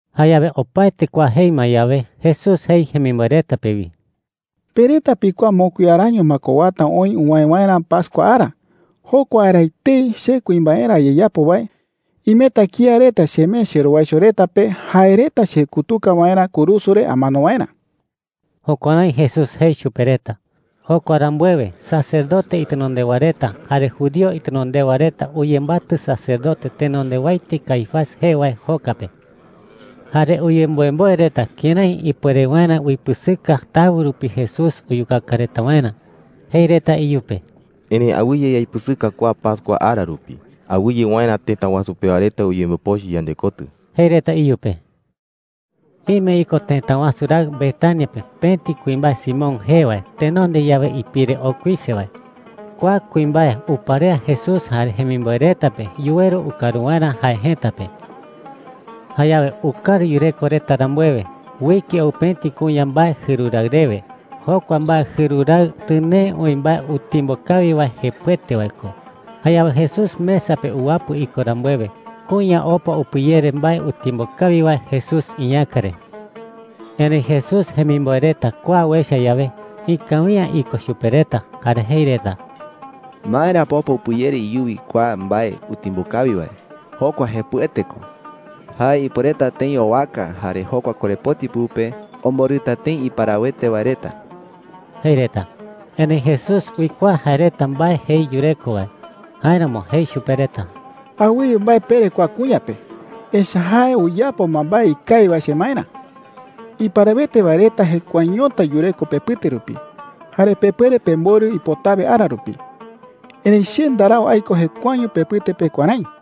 Jayawe opaete kua jei ma yawe, Jesús jei wi jemimboe reta pe: “Pe reta pikuaa mokui araño ma ko uata oï uwäe waerä pascua ara. Jokua ara etei, che kuimbaerä ayeyapo wae, imeta kía reta chemee cherowaicho reta pe jae reta chekutuka waerä kurusu re amano waerä.” Jukuärái Jesús jei chupe reta. Jokua rambuewe, sacerdote itenondewa reta jare judío itenondewa reta uyembatɨ sacerdote tenondewaete Caifás jee wae joka pe. Jare uyemboemboe reta kërái ipuere waerä uipɨsɨka tawɨ rupi Jesús uyukaka reta waerä. Jei reta iyupe: “Erëi awɨye yaipɨsɨka kua pascua ara rupi, awɨye waerä tëta wasu pewa reta uyembopochɨ yandekotɨ,” jei reta iyupe. Ime iko tëta wasu raɨ Betania pe pëti kuimbae Simón jee wae tenonde yawe ipire okuise wae. Kua kuimbae uparea Jesús jare jemimboe reta pe yuweru ukaru waerä jae jëta pe. Jayawe ukaru yureko reta rambuewe, uike ou pëti kuña mbae jɨru raɨ rewe. Jokua mbae jɨru raɨ tɨnee oï mbae utimbo kawi wae, jepɨete wae ko. Jayawe Jesús mesa pe uwapɨ iko rambuewe, kuña opa upɨyere mbae utimbo kawi wae Jesús iñäka re. Erëi Jesús jemimboe reta kua uecha yawe, ikawi’ä iko chupe reta, jare jei reta: “¿Maera pa opa upɨyere iyuwi kua mbae utimbo kawi wae? Jokua jepɨete ko. Jae ipuereta tëi owaka, jare jokua korepoti pɨpe omborɨta tëi iparawete wae reta,” jei reta. Erëi Jesús uikuaa jae reta mbae jei yureko wae. Jáeramo jei chupe reta: “Awɨye mbae pere kua kuña pe, echa’ä jae uyapo ma mbae ikawi wae chemaerä,” jei. “Iparawete wae reta jekuaeñota yureko pepɨte rupi, jare pepuere pemborɨ ipotawe ara rupi. Erëi che ndarau aiko jekuaeño pepɨte pe kuärái,” jei chupe reta.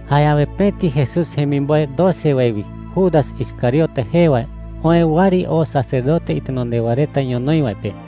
Jayawe pëti Jesús jemimboe doce wae wi, Judas Iscariote jee wae, oë wɨari oo sacerdote itenondewa reta ñonoï wae pe.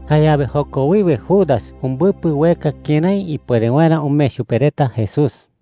Jayawe joko wiwe Judas umbɨpɨ ueka kërái ipuere waerä umee chupe reta Jesús.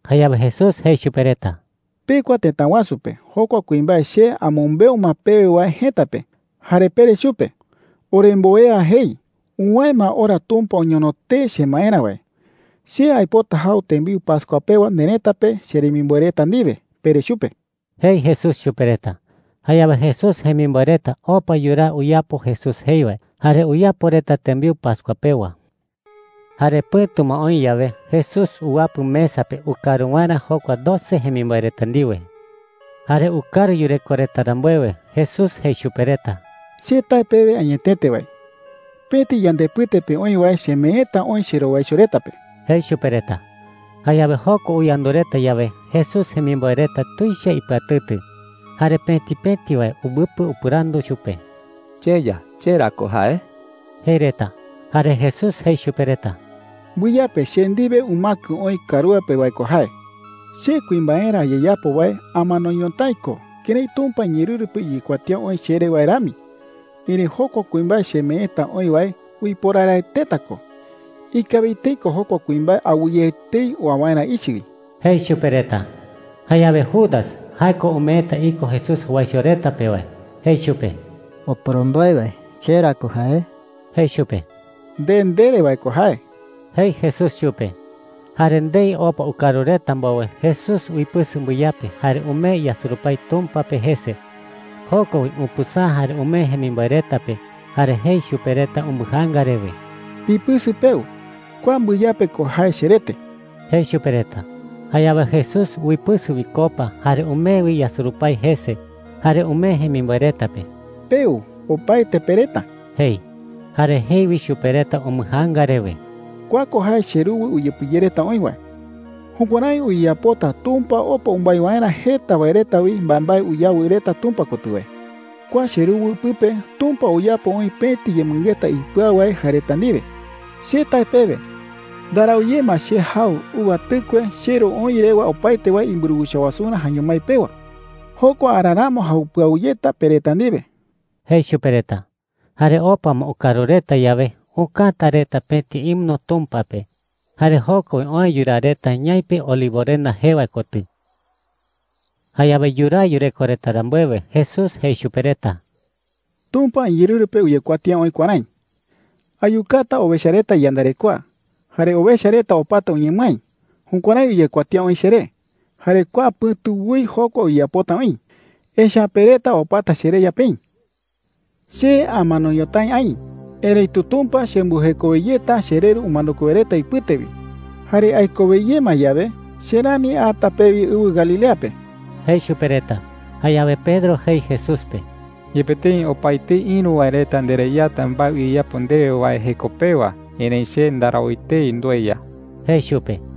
Jayawe Jesús jei chupe reta: “Pekua tëta wasu pe jokua kuimbae che amɨmbeu ma pewe wae jëta pe. Jare pere chupe: ‘Oremboea jei: Uwäe ma ora Tumpa oñono tee chemaerä wae. Che aipota jau tembiu pascua pewa nerëta pe cheremimboe reta ndiwe,’ pere chupe,” jei Jesús chupe reta. Jayawe Jesús jemimboe reta opa yuraa uyapo Jesús jei wae, jare uyapo reta tembiu pascua pewa. Jare pɨ̈tu ma oï yawe, Jesús uwapɨ mesa pe ukaru waerä jokua doce jemimboe reta ndiwe. Jare ukaru yureko reta rambuewe, Jesús jei chupe reta: “Che tae pewe añetete wae, pëti yandepɨte pe oï wae chemeeta oï cherowaicho reta pe,” jei chupe reta. Jayawe jokua uyandu reta yawe, Jesús jemimboe reta tuicha ipɨatɨtɨ. Jare pëti pëti wae umbɨpɨ upɨrandu chupe: “CheYa, ¿che ra ko jae?” jei reta. Jare Jesús jei chupe reta: “Mbɨyape che ndiwe umäkɨ oï karúa pe wae ko jae. Che kuimbaerä ayeyapo wae amano ñotái ko kërái Tumpa iñeerɨru pe uyekuatía oï cheré wae rami. Erëi jokua kuimbae chemeeta oï wae uiporaraeteta ko. Ikawi tëi ko jokua kuimbae awɨye etei oa waerä ichɨ wi,” jei chupe reta. Jayawe Judas – jae ko umeeta iko Jesús jowaicho reta pe wae – jei chupe: “Oporomboe wae, ¿che ra ko jae?” jei chupe. “Nde ndere wae ko jae,” jei Jesús chupe. Jare ndei opa ukaru reta mbowe, Jesús uipɨsɨ mbɨyape jare umee yasurupái Tumpa pe jese. Joko wi upɨsäa jare umee jemimboe reta pe, jare jei chupe reta umbɨjaanga rewe: “Pipɨsɨ peu. Kua mbɨyape ko jae cherete,” jei chupe reta. Jayawe Jesús uipɨsɨ wi copa, jare umee wi yasurupái jese, jare umee jemimboe reta pe. “Peu, opaete pe reta,” jei. Jare jei wi chupe reta umbɨjaanga rewe: “Kua ko jae cheruwɨ uyepɨyereta oï wae. Jukuärái uyeyapota Tumpa opa umbái waerä jeta wae reta wi mbaembae uyawɨ reta Tumpa kotɨ wae. Kua cheruwɨ pɨpe Tumpa uyapo oï pëti yemɨngeta ipɨau wae jae reta ndiwe,” jei. “Che tae pewe, ndarau ye ma che jau uva tɨkue cheRu oï rewa opaete wae imburuwicha wasurä jaeño mái pewa. Jokua ara ramo jau pɨau yeta pe reta ndiwe,” jei chupe reta. Jare opa ma ukaru reta yawe, ukäta reta pëti himno Tumpa pe. Jare joko wi oë yuraa reta ñaipe Olivorenda jee wae kotɨ. Jayawe yuraa yureko reta rambuewe, Jesús jei chupe reta: “Tumpa iñeerɨru pe uyekuatía oï kuärái: ‘Ayukata owecha reta iyandarekoa, jare owecha reta opata uñemɨái.’ Jukuärái uyekuatía oï cheré. Jare kua pɨ̈tu woi jokua uyeyapota oï, echa’ä pe reta opata chereya peï,” jei chupe reta. “Che amano ñotái aï. Erëitu Tumpa chembɨjekowe yeta chereru umanokue wae reta ipɨte wi. Jare aikowe ye ma yawe, che rani ata pewi ɨwɨ Galilea pe,” jei chupe reta. Jayawe Pedro jei Jesús pe: “Yepe tëi opaetei ïru wae reta ndereyata mbae uyeyapo ndewe wae jeko pewa, erëi che ndarau etei ndueya,” jei chupe.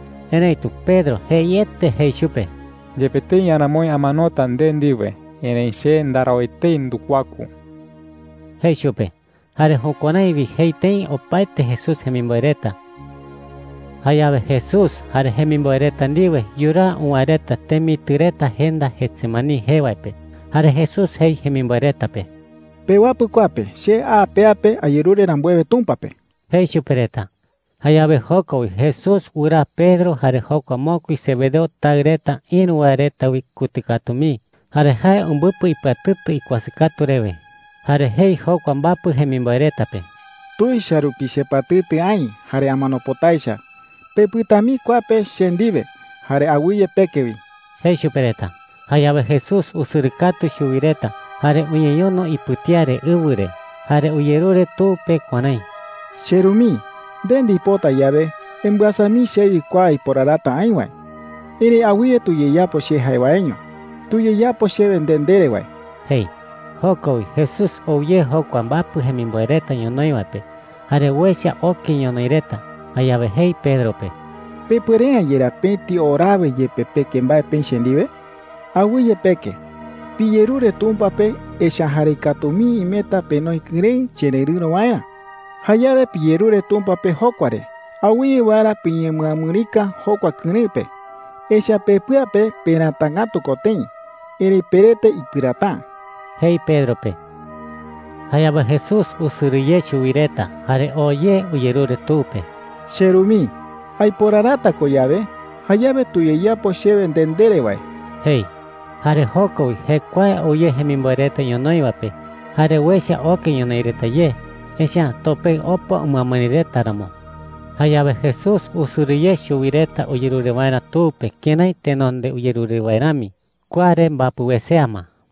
Erëitu Pedro jeiete jei chupe: “Yepe tëi aramoi amanota nde ndiwe, erëi che ndarau etei ndukuaku,” jei chupe. Jare jukuärái wi jei tëi opaete Jesús jemimboe reta. Jayawe Jesús jare jemimboe reta ndiwe yuraa uwäe reta temitɨ reta jenda Getsemaní jee wae pe. Jare Jesús jei jemimboe reta pe: “Pewapɨ kua pe che a pea pe ayerure rambuewe Tumpa pe,” jei chupe reta. Jayawe joko wi Jesús wɨraa Pedro jare jokua mokui Zebedeo taɨ reta ïru wae reta wi kutɨ katu mii. Jare jae umbɨpɨ ipɨatɨtɨ ikuasɨ katu rewe. Jare jei jokua mbapɨ jemimboe reta pe: “Tuicha rupi chepɨatɨtɨ aï jare amano pota echa. Pepɨta mii kua pe che ndiwe, jare awɨye peke wi,” jei chupe reta. Jayawe Jesús usɨrɨ katu chuwi reta, jare uñeñono ipɨtía re ɨwɨ re. Jare uyerure Tu pe kuärái: “CheRu mii, nde ndipota yawe, embɨasa mii chewi kua aiporarata aï wae. Erëi awɨye tuyeyapo che jae waeño. Tuyeyapo chewe nde ndere wae,” jei. Joko wi Jesús ou ye jokua mbapɨ jemimboe reta ñonoï wae pe, jare uecha oke ñonoï reta. Jayawe jei Pedro pe: “¿Pepuere’ä yerá pëti orawe yepe peke mbae peï che ndiwe?” jei chupe. “Awɨye peke. Piyerure Tumpa pe, echa’ä jarei katu mii imeta penoi kɨrëɨ chererɨ̈ro waerä. Jayawe piyerure Tumpa pe jokua re awɨye waerä piñemɨamɨrika jokua kɨrëɨ pe. Echa’ä pepɨa pe peratangätu ko tëi, erëi perete ipɨräta’ä,” jei Pedro pe. Jayawe Jesús usɨrɨ ye chuwi reta, jare oo ye uyerure Tu pe. “CheRu mii,” jei. “Aiporarata ko yawe, jayawe tuyeyapo chewe nde ndere wae,” jei. Jare joko wi jekuae ou ye jemimboe reta ñonoï wae pe. Jare uecha oke ñonoï reta ye, echa’ä topeɨ opa umɨamɨri reta ramo. Jayawe Jesús usɨrɨ ye chuwi reta uyerure waerä Tu pe kërái tenonde uyerure wae rami. Kua re mbapɨ wesea ma.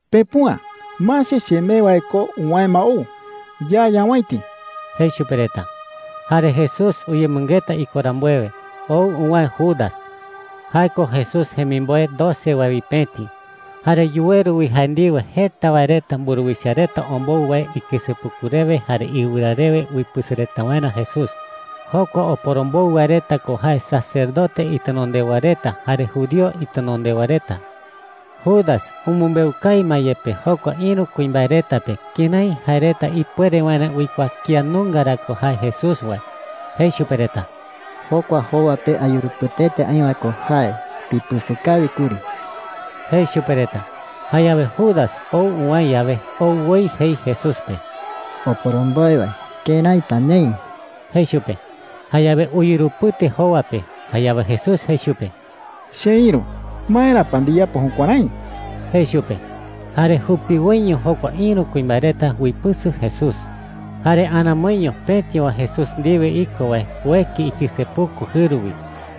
“Pepüa. Mase, chemee wae ko uwäe ma ou. Ya ñawäiti,” jei chupe reta. Jare Jesús uyemɨngeta iko rambuewe, ou uwäe Judas. Jae ko Jesús jemimboe doce wae wi pëti. Jare yuweru wi jae ndiwe jeta wae reta mburuwicha reta ombou wae ikɨsepuku rewe jare iɨwɨra rewe uipɨsɨ reta waerä Jesús. Jokua oporombou wae reta ko jae sacerdote itenondewa reta jare judío itenondewa reta. Judas umɨmbeu kawi ma yepe jokua ïru kuimbae reta pe kërái jae reta ipuere waerä uikuaa kía nunga ra ko jae Jesús wae. Jei chupe reta: “Jokua jowa pe ayurupɨteta aï wae ko jae. Pipɨsɨ kawi kuri,” jei chupe reta. Jayawe Judas ou uwäe yawe, ou woi jei Jesús pe: “Oporomboe wae, ¿kërái pa neï?” jei chupe. Jayawe uyurupɨte jowa pe. Jayawe Jesús jei chupe: “Cheïru, ¿maera pa ndiyapo jukuärái?” jei chupe. Jare jupiwoiño jokua ïru kuimbae reta uipɨsɨ Jesús. Jare aramoiño pëti wae Jesús ndiwe iko wae ueki ikɨsepuku jɨru wi,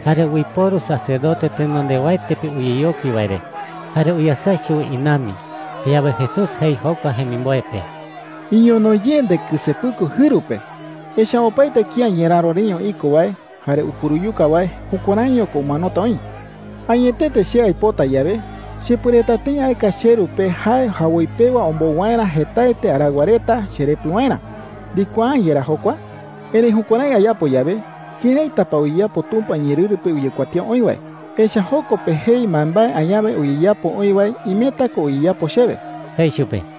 jare uiporu sacerdote tenondewaete pe uyeyokui wae re, jare uyasɨa chuwi inambi. Jayawe Jesús jei jokua jemimboe pe: “Iñono ye ndekɨsepuku jɨru pe. Echa’ä opaete kía ñeräro reño iko wae jare upuruyuka wae jukuäraiño ko umanota oï,” jei chupe. “Añetete che aipota yawe, chepuereta tëi aeka cheRu pe jae jawoi pewa ombou waerä jetaete araɨwa reta cherepɨ waerä. ¿Ndikuaa’ä yerá jokua?” jei chupe. “Erëi jukuärái ayapo yawe, ¿këraita pa uyeyapo Tumpa iñeerɨru pe uyekuatía oï wae? Echa’ä joko pe jei mbaembae añawe uyeyapo oï wae imeta ko uyeyapo chewe,” jei chupe.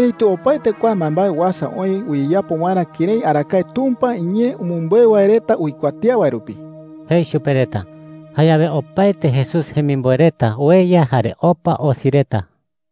“Erëitu opaete kua mbaembae uasa oï uyeyapo waerä kërái arakae Tumpa iñee umɨmbeu wae reta uikuatía wae rupi,” jei chupe reta. Jayawe opaete Jesús jemimboe reta ueya jare opa osi reta.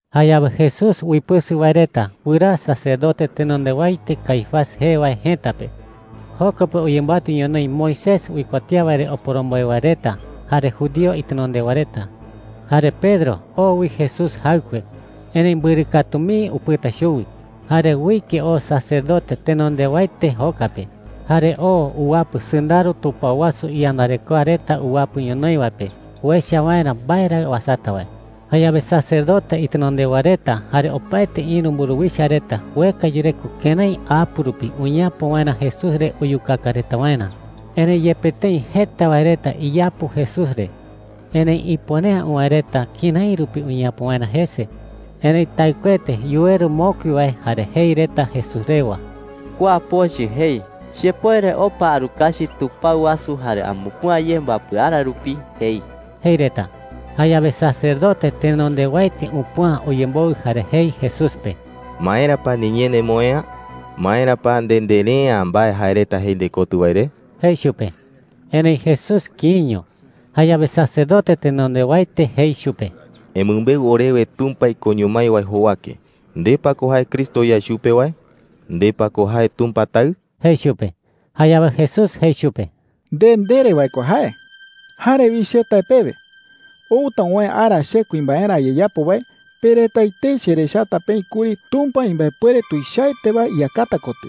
Jayawe Jesús uipɨsɨ wae reta wɨraa sacerdote tenondewaete Caifás jee wae jëta pe. Joko pe uyembatɨ ñonoï Moisés uikuatía wae re oporomboe wae reta jare judío itenondewa reta. Jare Pedro oo wi Jesús jaɨkue, erëi mbɨrɨ katu mii upɨta chuwi. Jare uike oo sacerdote tenondewaete joka pe, jare oo uwapɨ sɨndaro tupao wasu iyandarekoa reta uwapɨ ñonoï wae pe uecha waerä mbae ra uasata wae. Jayawe sacerdote itenondewa reta jare opaete ïru mburuwicha reta ueka yureko kërái apu rupi uñeapo waerä Jesús re uyukaka reta waerä. Erëi yepe tëi jeta wae reta iyapu Jesús re, erëi ipuere’ä uwäe reta kërái rupi uñeapo waerä jese. Erëi taɨkuete yuweru mokui wae jare jei reta Jesús rewa: “Kua pochɨ jei, ‘Chepuere opa arukachi tupao wasu jare amupüa ye mbapɨ ara rupi,’ jei,” jei reta. Jayawe sacerdote tenondewaete upüa uyemboɨ jare jei Jesús pe: “¿Maera pa niñee nemoë'ä? ¿Maera pa nde ndere’ä mbae jae reta jei ndekotɨ wae re?” jei chupe. Erëi Jesús kïiño. Jayawe sacerdote tenondewaete jei chupe: “Emɨmbeu orewe Tumpa ikoño mái wae jowake, ¿nde pa ko jae Cristo yae chupe wae? ¿Nde pa ko jae Tumpa Taɨ?” jei chupe. Jayawe Jesús jei chupe: “Nde ndere wae ko jae,” jei chupe. “Jare wi che tae pewe, outa uwäe ara che kuimbaerä ayeyapo wae, pe reta etei cherechata peï kuri Tumpa imbaepuere tuichaete wae iyakata kotɨ.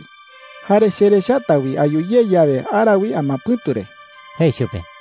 Jare cherechata wi ayu ye yawe ara wi amapɨ̈tu re,” jei chupe.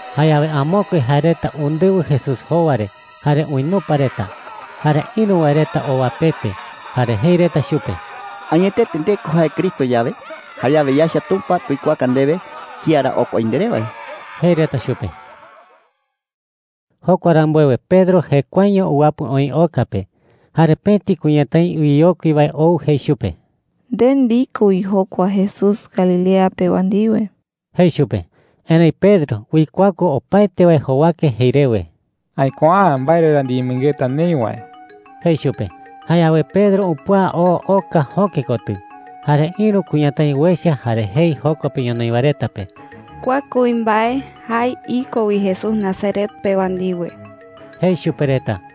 Jayawe amokue jae reta undɨwɨ Jesús jowa re jare uinupa reta. Jare ïru wae reta owapete, jare jei reta chupe: “Añetete nde ko jae Cristo yawe, jayawe yaecha Tumpa tuikuaaka ndewe kía ra okua oï nderé wae,” jei reta chupe. Jokua rambuewe Pedro jekuaeño uwapɨ oï oka pe. Jare pëti kuñatái uyeyokui wae ou jei chupe: “Nde ndiko wi jokua Jesús Galilea pewa ndiwe,” jei chupe. Erëi Pedro uikuaku opaete wae jowake jei rewe: “Aikuaa’ä mbae re ra ndiyemɨngeta neï wae,” jei chupe. Jayawe Pedro upüa oo oka jöke kotɨ. Jare ïru kuñatái uecha jare jei joko pe ñonoï wae reta pe: “Kua kuimbae, jae iko wi Jesús Nazaret pewa ndiwe,” jei chupe reta.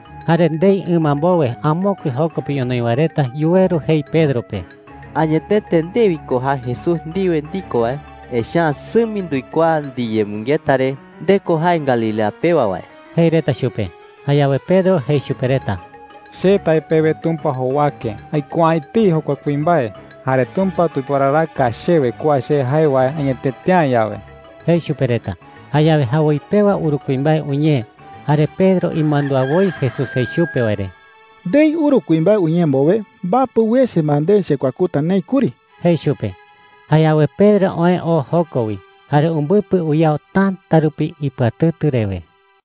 Jare ndei ɨma mbowe amokue joko pe ñonoï wae reta yuweru jei Pedro pe: “Añetete nde wi ko jae Jesús ndiwe ndiko wae, echa’ä sɨmi nduikuaa ndiyemɨngeta re nde ko jae Galilea pewa wae,” jei reta chupe. Jayawe Pedro jei chupe reta: “Che tae pewe Tumpa jowake, ¡aikuaa’ä etei jokua kuimbae! Jare Tumpa tuiporaraka chewe kua che jae wae añetete’ä yawe,” jei chupe reta. Jayawe jawoi pewa uru kuimbae uñee. Jare Pedro imandúa woi Jesús jei chupe wae re: “Ndei uru kuimbae uñee mbowe, mbapɨ wese ma nde chekuakuta neï kuri,” jei chupe. Jayawe Pedro oë oo joko wi, jare umbɨpɨ uyao täta rupi ipɨatɨtɨ rewe.